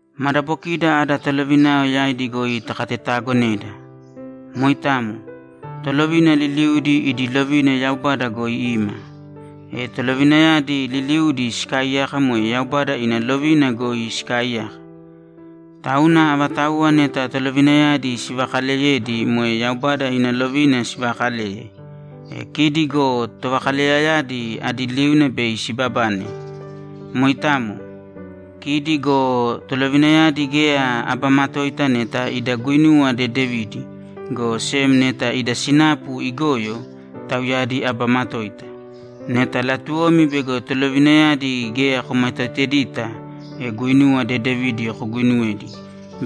Madabokida ada tolovinayao yaidi goi takatetaagonēda. Moitamo. Tolovina liliudi idi lovina Yaubada goi ima. E tolovinayadi liliudi sikaaiyaka moe Yaubada ina lovina goi sikaaiyaka. Tauna avatauwa neta tolovinayadi sivakaleyedi moe Yaubada ina lovina sivakaleye. E kidi go tovakaleyayadi adi liuna bei sibabane. Moitamo. Kidi go tolovinayadi geya aba matoita neta ida guinuwa dedevidi, go sem neta ida sinapu igoyo, tauyadi aba matoita. Neta latuwomi bego tolovinayadi geya komatoitedita, e guinuwa dedevidi koguinuwēdi,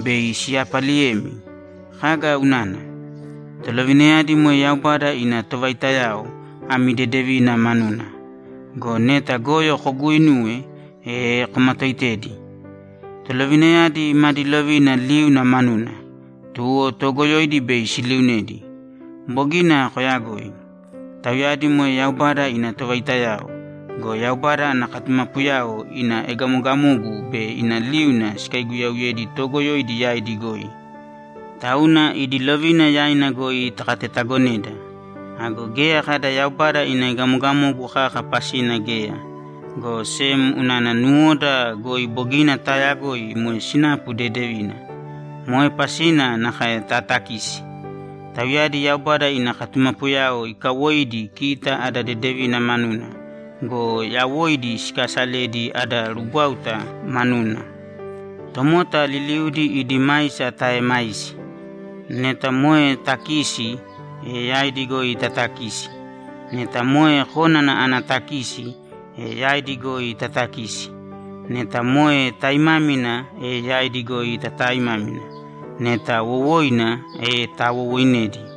bei siyapaliyemi. Kaga unana? Tolovinayadi moe Yaubada ina tovaitayao ami dedevina manuna. Go neta goyo koguuinuwe, e komatooitēdi. Tolovinayadi madi lovina liuna manuna, tuwo toogoyoidi bei siliunedi. Bogina koyagoi. Tauyadi moe Yaubada ina tovaitayao go, Yaubada ana katumapuyao ina egamogamogu be ina liuna sikaiguyauyedi toogoyoidi yaidi goi. Tauna idi lovina yaina goi takatetaagonēda. Ago geya kada Yaubada ina egamogamogu kaka pasina geya, go sem unana nuwoda goi bogina taayagoi moe sinapu dedevina. Moe pasina nakae tatakisi. Tauyadi Yaubada ana katumapuyao ikawoidi kita ada dedevina manuna go, yawoidi sikaasaledi ada rugwáuta manuna. Tomota liliudi idi maisa taaemāisi. Neta moe takisi, e yaidi goi taatakīsi. Neta moe kónana ana takisi, e yaidi goi taatakīsi. Neta moe taimámina, e yaidi goi tataaimāmina. Neta wowoina, e tawowooinēdi.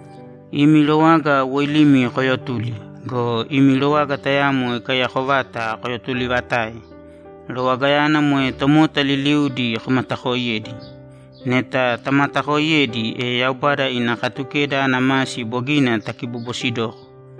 Imi rowaga woilīmi koyotūli go, imi rowaga tayamo ikaiyako vata koyotulivatāe. Rowagayana moe tomota liliudi komatakoiyēdi. Neta tamatakoiyedi, e Yaubada ina Katukeda ana masi bogina takibobosidoko.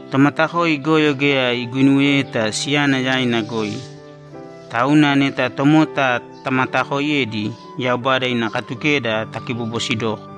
Tomatakoi goyo geya iguinuweyeta siyana yaina goi. Tauna neta tomota tamatakoiyedi, Yaubada ina Katukeda takibobosidoko.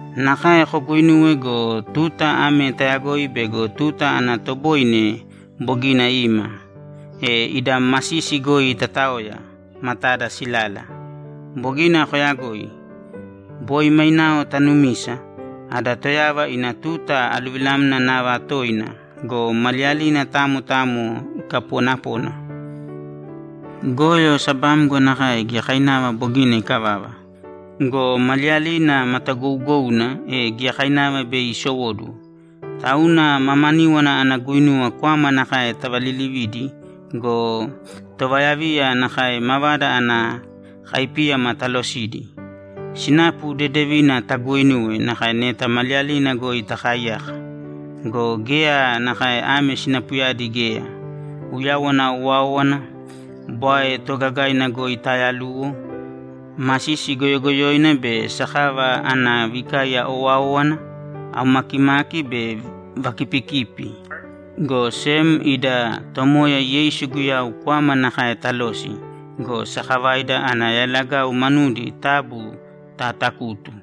Nakae koguinūwe go, tuta ame tayagoi bego tuta ana toboine bogina ima, e ida masisi goi tataoya, matada silala. Bogina koyagoi. Boi mainao tanumisa, ada Toyava ina tuta aluvilamna nava toina go, maliyalina tamo tamo ikapoonapona. Goyo sabamgo nakae giyakainava bogina ikavava go, maliyalina matagougouna, e giyakainava bei isowóduwo. Tauna mamaníwana ana guinuwa kwama nakae tavalilivīdi go, tovayaviya nakae mavada ana kaipíyama talosīdi. Sinapu dedevina taguuinūwe nakae neta maliyalina goi takaaiyaka. Go geya nakae ame sinapuyadi geya: Uyawana owáowana, bwae toogagaina goi tayaluwo, masisi goyogoyoina be sakava ana vikaiya owáowana, aumakimaki be vakipikipi, go sem ida Tomoya Yeisu Guyau kwama nakae talōsi go, sakavaida ana yalagau manudi taabu taatakūtu.